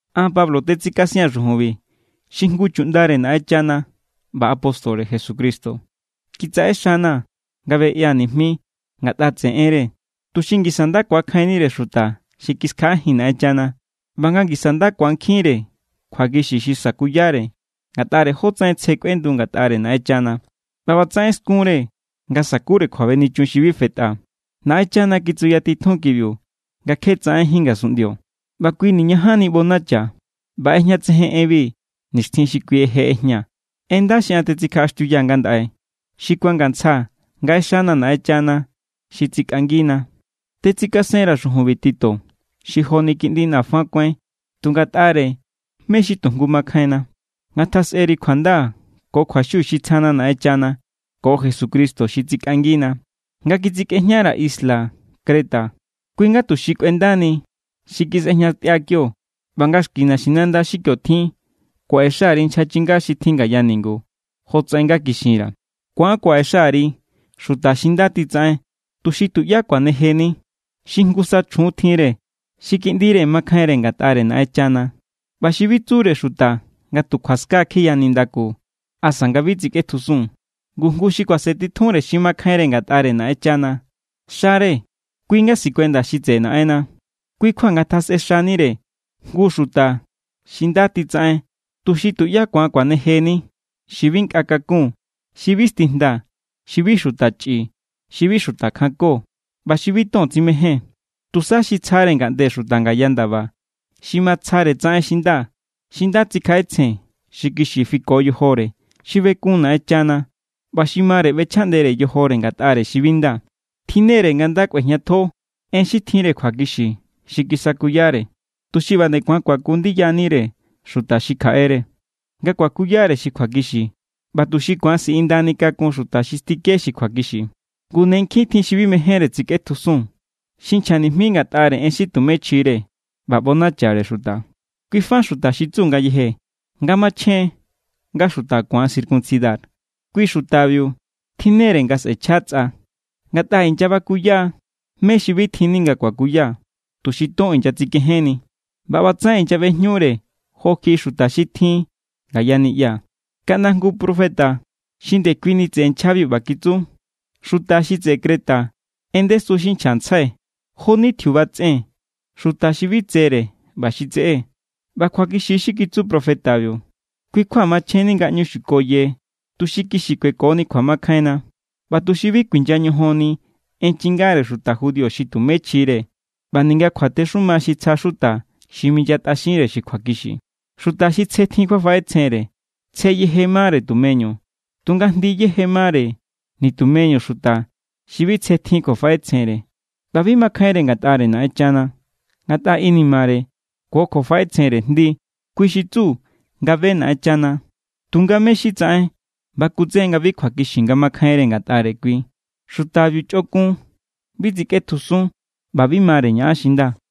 An, Pablo, tetsikasia̱n xujunbi, xi jngu chuꞌndare Naꞌenchana ꞌba apóstore Jesucristo. Kitsaꞌe xana̱ nga beꞌia̱ nijmi ngatꞌa tseꞌe enre, tuxi ngisa nda ku̱akjainnire xuta xi kiskjaꞌajin Naꞌenchana ꞌba nga ngisa nda ku̱ankjinre kjuakixi xi sakuyare ngatꞌare jótsaꞌen tsje kꞌuendu ngatꞌare Naꞌenchana. ꞌBa ꞌbatsaꞌen skunre nga sa̱kure kjuabenichun xi bi fetꞌa. Naꞌenchana kitsuyatitjun kibiu nga kje tsaꞌenjín ngasunꞌndio, ꞌba kui niñajanni ꞌbonacha. ꞌBa ꞌejñatsejen enbi nixtjin xi kui je ꞌejñaa̱, en nda xi an tetsikjaꞌaxtiuyaa̱ ngandaꞌe, xi kuangantsja nga ꞌexana̱ Naꞌenchana xi tsikꞌangina. Tetsikasenra̱ xujunbi Tito, xi joni kiꞌndina̱ fa kuáin tu ngatꞌare mé= xi tu jngu makjainna. Ngatjasꞌeri kjuanda ko kjuaxiu xi tsjana Naꞌenchana ko Jesucristo xi tsikꞌangina. Nga kitsikꞌejñara̱ isla Creta kui= nga tuxi kꞌuendani xi kisꞌejñatꞌia kio ꞌba nga xki naxinanda xi tjin kio kuaꞌexa_ri nchja chinga xi tjin ngaya ningu, jotsaꞌen nga kixinra̱. Ku̱an kuaꞌe xare xuta xi nda titsaꞌen tuxi tuꞌyá kuanejeni, xi jngusa chjun tjinre, xi kiꞌndire makjainre ngatꞌare Naꞌenchana ꞌba xi bi tsure xuta nga tu kjuaska kjiya nindaku asa nga bi tsikꞌetjusun. Ngu jngu xi kuasentitjunre xi makjainre ngatꞌare Naꞌenchana, xare kui nga sikuenda xi tseꞌe Naꞌenna. Kui= kjua ngatjasꞌe xanire jngu xuta xi nda titsaꞌen tuxi tuꞌyá ku̱an kuanejeni, xi bi nkꞌa kakun, xi bi stijnda, xi bi xuta chꞌi, xi bi xuta kjanko, ꞌba xi bi ton tsimején, tusa xi tsjare ngaꞌnde xuta ngaya ndaba, xi matsjare tsaꞌen xi nda, xi nda tsikjaꞌetsjen, xi kixi fiko yojore, xi bekun Naꞌenchana, ꞌba xi mare ꞌbechjaꞌndere yojore ngatꞌare xi bi nda. Tjinne=re nga nda kꞌuejñatjo en xi tjinre kjuakixi xi kisakuyare, tuxi ꞌba nde ku̱an kuaku ndiyanire xuta xi kjaꞌere nga kuakuyare xi kjuakixi, ꞌba tuxi ku̱an siꞌindani kakun xuta xi stike xi kjuakixi. Ngu ne nkjin tjin xi bi mejénre tsikꞌetjusun, xi nchja nijmi ngatꞌare en xi tumé chjire ꞌba ꞌbonachare xuta. Kui fa xuta xi tsu ngayeje nga machjen nga xuta ku̱an circuncidar. Kui xutabiu tjinnere nga sꞌe̱chja tsꞌa, ngatꞌa inyabakuya= mé= xi bi tjinni nga kuakuya, tuxi ton inyatsikejenni. ꞌBa ꞌbatsaꞌen inyaꞌbejñure jo kjiꞌi xuta xi tjin ngaya niꞌya. Kaꞌnda jngu profeta xi ndekuini tseꞌe nchjabiu ꞌba kitsu: “Xuta xi tseꞌe Creta en ndesu xi nchjantsjai. Jo=ni tjiuba tsꞌen, xuta xi bi tsere ꞌba xi tseꞌé.” ꞌBa kjuakixi= xi kitsu profetabiu. Kui= kjua machjenni nga ꞌñu xukoye, tuxi kixi kuekoni kjuamakjainna ꞌba tuxi bi kuinya ñojonni en chingare xuta judío xi tumé chjire ꞌba ninga kjuatexuma xi tsja xuta xi minyatꞌaxinre xi kjuakixi. Xuta xi tsje tjin kjuafaꞌetsjenre tsje yeje mare tumeñu. Tunga jndi yeje= mare nitumeñu xuta xi bi tsje tjin kjuafaꞌetsjenre ꞌba bi makjainre ngatꞌare Naꞌenchana, ngatꞌa inimare ko kjuafaꞌetsjenre jndi. Kui xi tsu nga be Naꞌenchana, tunga mé= xi tsaꞌen bakutsejen nga bi kjuakixi nga makjainre ngatꞌare kui. Xutabiu chꞌokun, bi tsikꞌetjusun, ꞌba bi mare ñaꞌan xi nda.